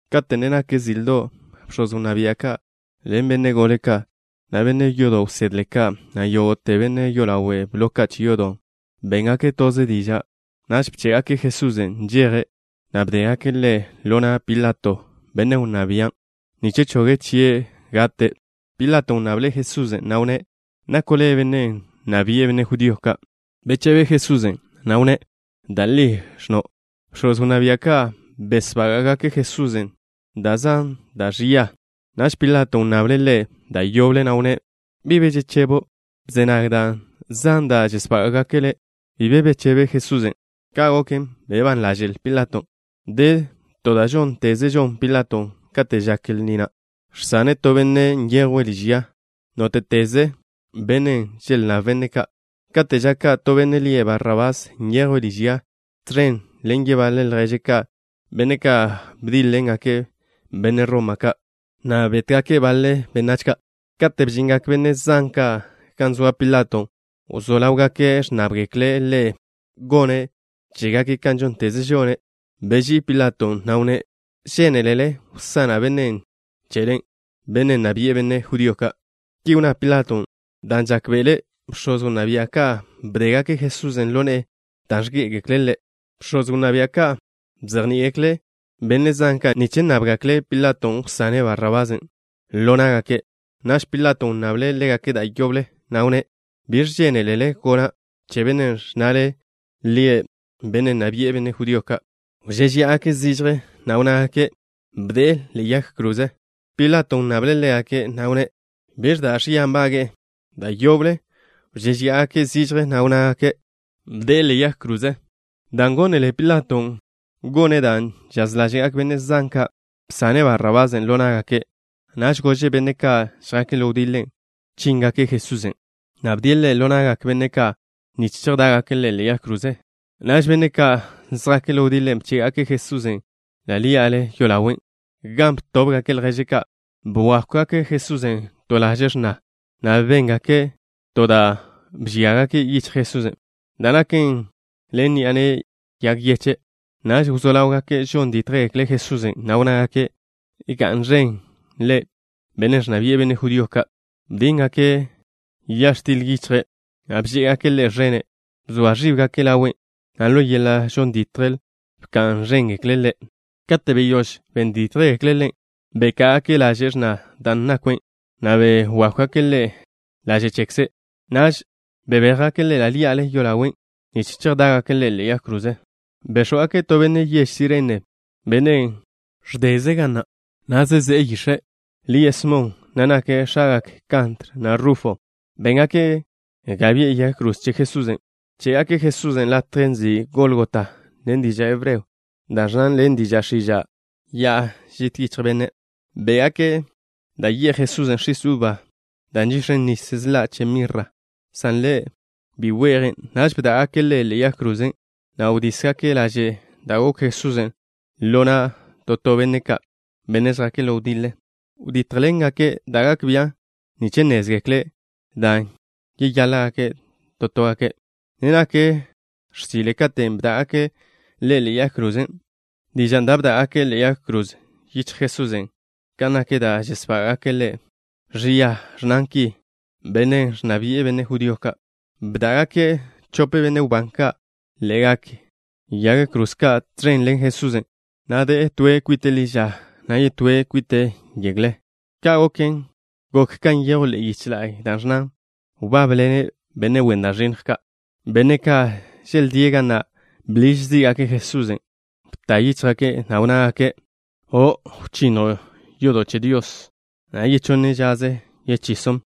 Kate' ne nak zildo', bx̱oz wnná bia' ka' ḻen benne' gole ka', na' benne' yodo' wsedle ka', na' yógo'te benne' yolawe' blo che yodo', béngake' toze diža'. Naž bché'gake' Jesusen' nžeje', na' bdégake' Ḻe' ḻo na' Pilato, bennen' wnná bian', nich choge' chie' gate'. Pilaton' wnnable' Jesusen', na' wnné': —¿Nako' le' benne' nna bi'e benne' judío ka'? Bechebe Jesusen', na' wnné': —Da' li ẕnno'. Bx̱oz wnná bia' ka' besbága'gake' Jesusen' da' zan da' ẕia. Naž Pilaton' wnnable' Ḻe' da' yoble, na' wnné': —¿Bi be žechebo'? Bze nag da' zan da' žesbága'gake' le'. Bi be bechebe Jesusen'. Ka' goken, bebán ḻaže'l Pilaton'. De to da' žónteze žon Pilaton' kate' žak lni na', žsane' to benne' nyejwe' liž ya, nóte'teze benne' želnnáb benne' ka'. Kate' ža ka' to benne' lie' Barrabás nyejwe' liž ya, tẕen ḻen yebaḻe lježe' ka', benne' ka' bdíḻ-ḻengake' benne' Roma ka', na' bétgake' baḻe benách ka'. Kate' bžingak benne' zan ka' gan zoa Pilaton', wzó ḻáwgake' ẕnnábgekle' ḻe' gone' chégake' ka žónteze žone'. Beží'i Pilaton', na' wnné': —¿Žénelele wsana' bennen' chele, bennen' nna bi'e benne' judío ka'? Ki wnná Pilaton' dan' žákbe'ele' bx̱oz wnná bia' ka' bdégake' Jesusen' ḻo ne'e dan' ẕgé'egekle' Ḻe'. Bx̱oz wnná bia' ka' bzejní'igekle' benne' zan ka' nich nnábgekle' Pilaton' wsane' Barrabasen' ḻo ná'gake'. Naž Pilaton' wnnable' ḻégake' da' yoble, na' wnné': —¿Biẕ žénelele gona' che bennen' ẕnnale lie' benne' nna bi'e benne' judío ka'? Wžéžeya'agake' zižje, na' wnnágake': —¡Bde'e ḻe'e yag kroze! Pilaton' wnnable' ḻégake', na' wnné': —¿Biẕ da' ẕia nbage'e? Da' yoble wžéžeya'agake' zižje, na' wnnágake': —¡Bde'e ḻe'e yag kroze! Dan' gónele Pilaton' gone' dan' chaž ḻáže'gak benne' zan ka', bsane' Barrabasen' ḻo ná'gake'. Naž gože' benne' ka' žjake' ḻo wdiḻe, chíngake' Jesusen', na' bdie' Ḻe' ḻo na'gak benne' ka' nich chejdá'gake' Ḻe' ḻe'e yag kroze. Naž benne' ka' žjake' ḻo wdiḻe, bché'gake' Jesusen' ḻi'a yolawe', gan btóbgake' ljéžgake' ka'. Bwákwgake' Jesusen' to laže' x̱na, na' béngake' to da' bžíagake' yichj Jesusen', dan' naken ḻen ni'a ne'e yag yeche'. Naž wzó ḻáwgake' žon dítjgekle' Jesusen', na' wnnágake': —¡Ga'n ẕen le', benne' ẕnna bi'e benne' judío ka'! Bdíngake' ya x̱til yichje', na' bžé'egake' Ḻe' ẕene'. Bzoa ẕíbgake' ḻawe', na' ḻo yeḻa' žon ditjle bka'n ẕéngake' Ḻe'. Kate' beyóž ben dítjgekle' Ḻe', beká'agake' laže' x̱nan' da' nakwe', na' begákwgake' Ḻe' laže' chekze'. Naž bebéjgake' Ḻe' ḻa' ḻí'ale yolawen' nich chejdá'gake' Ḻe' ḻe'e yag kroze. Béx̱wgake' to benne' yež Sirene, benne' ẕdeze' ga na', na' zezé'e yix̱e'. Lie' Smon, na' nake' x̱agak Kantr, na' Rufo. Béngake' ga bi'e yag kroze che Jesusen'. Bché'gake' Jesusen' latjen' nzin' Gólgota, to diža' hebreo da' ẕnnan ḻen diža' x̱iža', Ya'a Žit Yichj Benne'. Bé'gake' da' ye'j Jesusen' x̱is uba da' nžix̱en než sḻa' che mirra, san Ḻe' bi we'jen'. Naž bdá'gake' Ḻe' ḻe'e yag kroze, na' wdísgake' laže' da' gokw Jesusen' ḻo na' to to benne' ka', benne' žjake' ḻo wdiḻe. Bebéjgake' da' gak bian' nich nnézgekle' dan' yeyaḻa' to toe'. Ne nak x̱sile katen' bdá'gake' Ḻe' ḻe'e yag krozen'. Dižan' da' bdá'gake' ḻe'e yag kroze yichjle Jesusen' kan nak da' žesbága'gake' Ḻe' ẕia ẕnnan ki: “Benne' ẕnna bi'e benne' judío ka'.” Bdá'gake' chope benne' wbán ka' ḻe'egak yag kroze ka' tẕen ḻen Jesusen', na' de'e toe' kwite' ḻi ža, na' yetóe' kwite' yegle. Ka' goken, gok kan nyejw ḻe'e yiche la'y, da' ẕnnan: “Wbábḻene' benne' wen da' ẕinnj ka'.” Benne' ka' želdíe' ga na' bḻiž zí'gake' Jesusen'. Bta yíchjgake', na' wnnágake': —¡O'! ¿Wchinnjo' yodo' che Dios, na' yechonne žaze yechison'?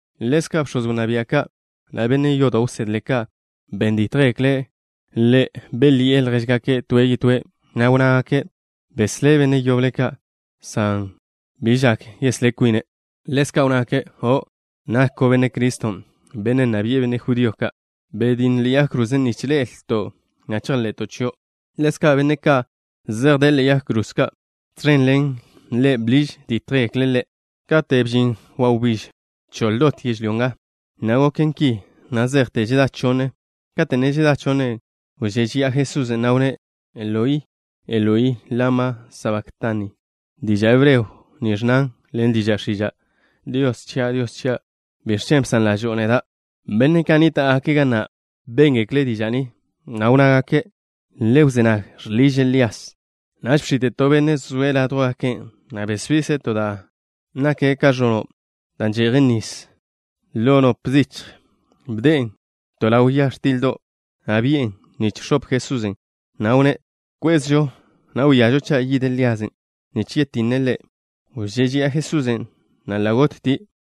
Ḻezka' bx̱oz wnná bia' ka', na' benne' yodo' wsedle ka', ben dítjgekle' Ḻe'. Belyi'e ljéžgake' toe' yetóe', na' wnnágake': —Beslé' benne' yoble ka', san bi gak yeslá kwine'. Ḻezka' wnnágake': —¡O'! ¿Nako' Benne' Criston', benne' nna bi'e benne' judío ka'? Betj na'a ḻe'e yag krozen' nich ḻe'elton', na' chejḻe'to' chio'. Ḻezka' benne' ka' zej de'e ḻe'egak yag kroze ka' tẕen ḻen Ḻe', bḻiž dítjgekle' Ḻe'. Kate' bžin wawbíž, bchoḻ dot yežlyó nga, na' goken ki na' zejte žedá chonne. Kate' ne žedá chonne, wžéžeya'a Jesusen', na' wnné': —Eloi, Eloi, ¿lama sabaktani? Diža' hebreo ni ẕnnan ḻen diža' x̱iža': “Dios chia', Dios chia', ¿biẕ chen' bsan ḻažo'o neda'?” Benne' ka' nníta'gake' ga na' béngekle' diža' ni, na' wnnágake': —Le wzé nag. Žḻiže' Lías. Naž bx̱ite' to benne' zoe' ládjwgake', na' besbise' to da' bḻole da' že'jen nis ḻo nop zichj. Bde'en to ḻaw ya x̱tildo', na' bi'en nich x̱op Jesusen', na' wnné': —Kwezžo, na' wíažo cha' yid Líasen' nich yetinne' Ḻe'. Wžéžeya'a Jesusen', na' ḻa' gottie'.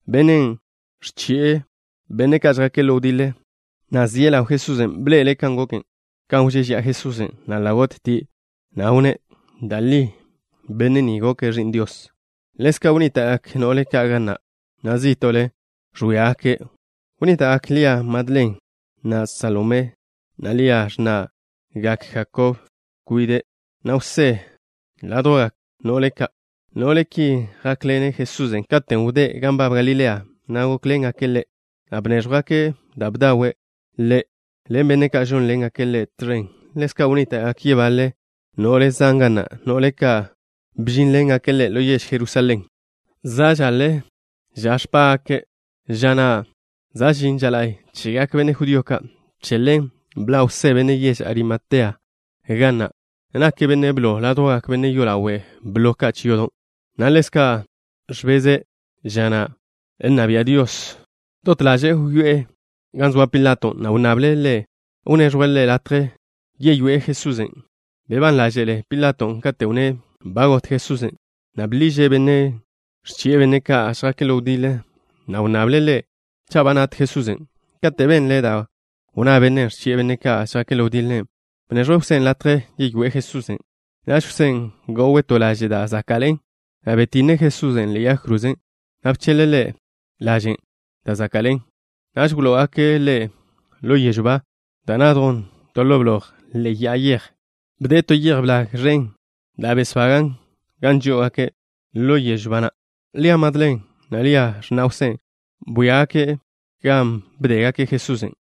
Bennen' ẕchi'e benne' ka' žjake' ḻo wdiḻe, na' zie' ḻaw Jesusen', bḻe'ele' kan goken, kan wžéžeya'a Jesusen', na' ḻa' gottie', na' wnné': —Da' li benne' ni goke' Ẕi'n Dios. Ḻezka' wnníta'gak no'le ka' ga na', na' zí'to'le ẕwíagake'. Wnníta'gak Lia Madlen, na' Salomé, na' Lia, x̱na'gak Jakob kwide', na' Jwsé ládjwgak no'le ka'. No'le ki jákḻene' Jesusen' katen' wdé' gan nbab Galilea, na' gókḻengake' Ḻe', na' bnéẕjwgake' da' bdawe' Ḻe' ḻen benne' ka' žónḻengake' Ḻe' tẕen. Ḻezka' wnníta'gak yebaḻe no'le zan ga na', no'le ka' bžínḻengake' Ḻe' ḻo yež Jerusalén. Za' žaḻe ža ẕpá'gake', ža na' za' žin ža la'y chegak benne' judío ka'. Che ḻen bḻa' Jwsé, benne' yež Arimatea, ga na'. Nake' benne' blo ládjwgak benne' yolawe' blo che yodo', na' ḻezka' ẕbeze' ža nna bia' Dios. Dot ḻaže'e wyoé'e gan zoa Pilato, na' wnnable' ḻe' wneẕjwe' ḻe' latje yeywé'e Jesusen'. Bebán ḻáže'le Pilaton' kate' wnné' ba got Jesusen', na' bḻiže' bennen' ẕchi'e benne' ka' žjake' ḻo wdiḻe, na' wnnable' ḻe' cha' ba nat Jesusen'. Kate' benle' da' wnná bennen' ẕchi'e benne' ka' žjake' ḻo wdiḻe, bneẕjwe' Jwsén' latje yeywé'e Jesusen'. Naž Jwsén' go'we' to laže' da' záka'ḻe'en, na' betinne' Jesusen' ḻe'e yag kroze, na' bcheḻ-le' Ḻe' lažen' da' záka'ḻe'en. Naž wló'ogake' Ḻe' ḻo yežw ba da' nadjen to ḻo bloj ḻe'e ya'a yej. Bde'e to yej blag ẕen da' besbagan' gan žó'ogake' ḻo yežw ba na'. Lia Madlen, na' Lia, x̱na' Jwsé, bwíagake' gan bdégake' Jesusen'.